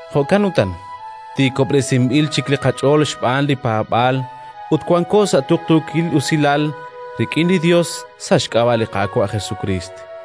Jo'kan utan, tiikob'resinb'il chik li qach'ool xb'aan li paab'aal, ut wanko sa' tuqtuukil usilal rik'in li Yos sa' xk'ab'a' li Qaawa' Jesukriist.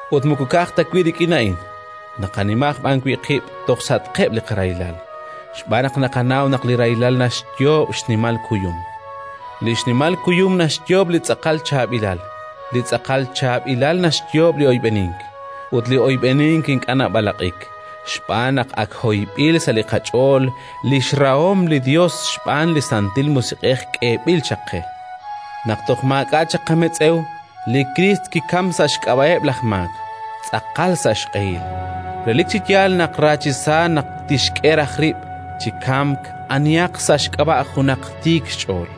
Ut moko ka'aj ta wi' rik'in a'in, naqanima aj b'an wi' qib' toj sa'atqeb' li qarahilal, xb'aan naq naqanaw naq li rahilal naxyoob' xnimal kuyum; li xnimal kuyum naxyoob' li tz'aqal chaab'ilal; li tz'aqal chaab'ilal naxyoob' li oyb'enink, ut li oyb'enink ink'a' nab'alaq'ik xb'aan naq ak hoyb'il sa' li qach'ool li xrahom li Yos xb'aan li Santil Musiq'ej k'eeb'il chaq qe. Naq toj maak'a' chaq qametz'ew, li Kriist kikamk sa' xk'ab'a'eb' laj maak, tz'aqal sa' xq'ehil. Relik chi yaal naq ra chi sa naq tixk'e raj rib' chi kamk anihaq sa' xk'ab'a' junaq tiik xch'ool;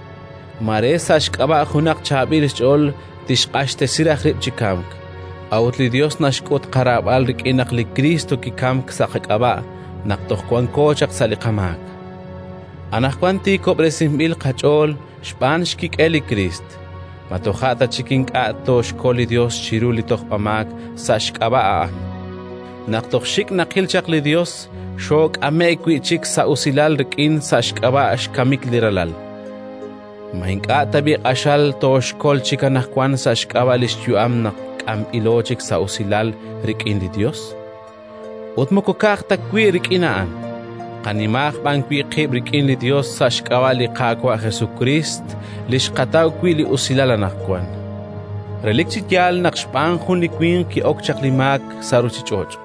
mare sa' xk'ab'a' junaq chaab'il xch'ool tixq'axtesi raj rib' chi kamk. A'ut li Yos naxk'ut qaraab'al rik'in naq li Kriist kikamk sa' qak'ab'a' naq toj wanko chaq sa' li qamaak. Anaqwan tiikob'resinb'il qach'ool xb'aan xkik'el li Kriist: ma toja' ta chik ink'a' tooxkol li Yos chiru li tojb'amaak sa' xk'ab'a' A'an? Naq toj xik' naqil chaq li Yos, xook'ame'k wi' chik sa' usilal rik'in sa' xk'ab'a' xkamik li Ralal; ma ink'a' tab'i' q'axal tooxkol chik anaqwan sa' xk'ab'a' li xyu'am naq k'amb'ilo chik sa' usilal rik'in li Yos? Ut moko ka'aj ta wi' rik'in a'an, naqanima aj b'an wi' qib' rik'in li Yos sa' xk'ab'a' li Qaawa' Jesukriist li xqataw wi' li usilal anaqwan. Relik chi yaal naq xb'aan jun chi winq ki'ok chaq li maak sa' ruuchich'och',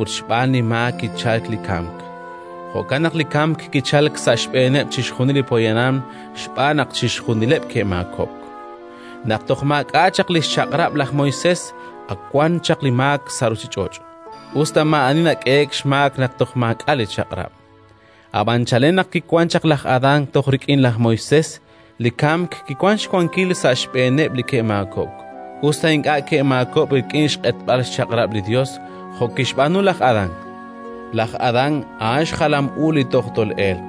ut xb'aan li maak kichalk li kamk. Jo'kan naq li kamk kichalk sa' xb'eeneb' chixjunil li poyanam xb'aan naq chixjunileb' ke'maakob'k. Naq toj maak'a' chaq li xChaq'rab' laj Moisés, ak wan chaq li maak sa' ruuchich'och', us ta maa'ani nak'ehe'k xmaak naq toj maak'a' li Chaq'rab'. Ab'an chalen naq kiwank chaq laj Adán toj rik'in laj Moisés, li kamk kiwank xwankil sa' xb'eeneb' li ke'maakob'k, us ta ink'a' ke'maakob'k rik'in xq'etb'al xchaq'rab' li Yos jo' kixb'aanu laj Adán. Laj Adán a'an xjalam u Li toj tol'elq.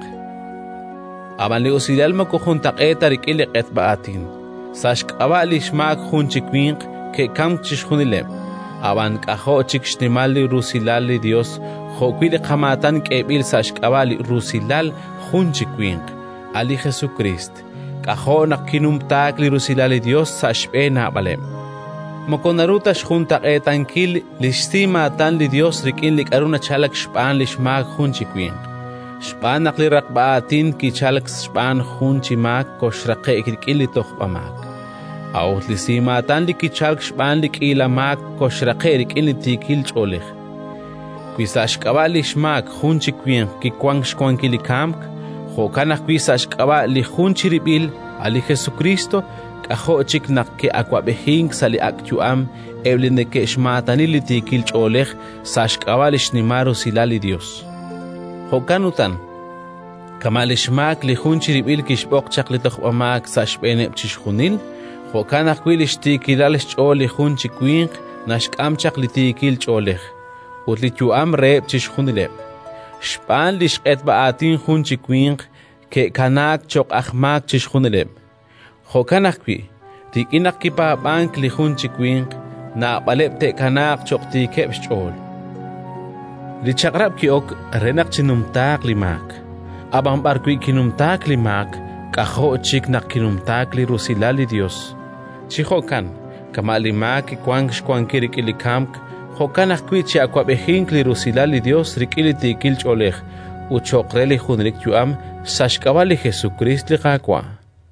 Ab'an li usilal moko juntaq'eet ta rik'in li q'etb'a aatin. Sa' xk'ab'a' li xmaak jun chi winq ke'kamk chixjunileb'; ab'an k'ajo' chik xnimal li rusilal li Yos jo'wi' li qamaatan k'eeb'il sa' xk'ab'a' li rusilal jun chi winq, a' li Jesukriist! K'ajo' naq kinumtaak li rusilal li Yos sa' xb'een naab'aleb'! Moko naru ta xjuntaq'eetankil li xsimaatan li Yos rik'in li k'aru nachalk xb'aan li xmaak jun chi winq. Xb'aan naq li raqb'a aatin li kichalk xb'aan jun chi maak koxraqe'q rik'in li tojb'amaak; a'ut li simaatan li kichalk xb'aan li k'iila maak koxraqe'q rik'in li tiikil ch'oolej. Wi sa' xk'ab'a' li xmaak jun chi winq kiwank xwankil li kamk, jo'kan ajwi' sa' xk'ab'a' li jun chirib'il, a' li Jesukriist, k'ajo' chik naq te'awab'ejinq sa' li ak' yu'am eb' li neke'xmaatani chi yo'oon li tiikil ch'oolej, sa' xk'ab'a' xnimal rusilal li Yos! Jo'kan utan, kama' li xmaak li jun chirib'il kixb'oq chaq li tojb'amaak sa' xb'eeneb' chixjunil, jo'kan ajwi' li xtiikilal xch'ool li jun chi winq naxk'am chaq li tiikil ch'oolej ut li yu'am reheb' chixjunileb'. Xb'aan li xq'etb'a aatin jun chi winq ke'kanaak cho'q aj maak chixjunileb'; jo'kan ajwi', rik'in naq kipaab'ank li jun chi winq, naab'aleb' te'kanaaq cho'q tiikeb' xch'ool. Li Chaq'rab' ki'ok re naq chinumtaaq li maak. Ab'an b'arwi' kinumtaak li maak, k'ajo' chik naq kinumtaak li rusilal li Yos. Chi jo'kan, kama' li maak kiwank xwankil rik'in li kamk, jo'kan ajwi' chi'awab'ejinq li rusilal li Yos rik'in li tiikil ch'oolej ut cho'q re li junelik yu'am, sa' xk'ab'a' li Jesukriist, li Qaawa'!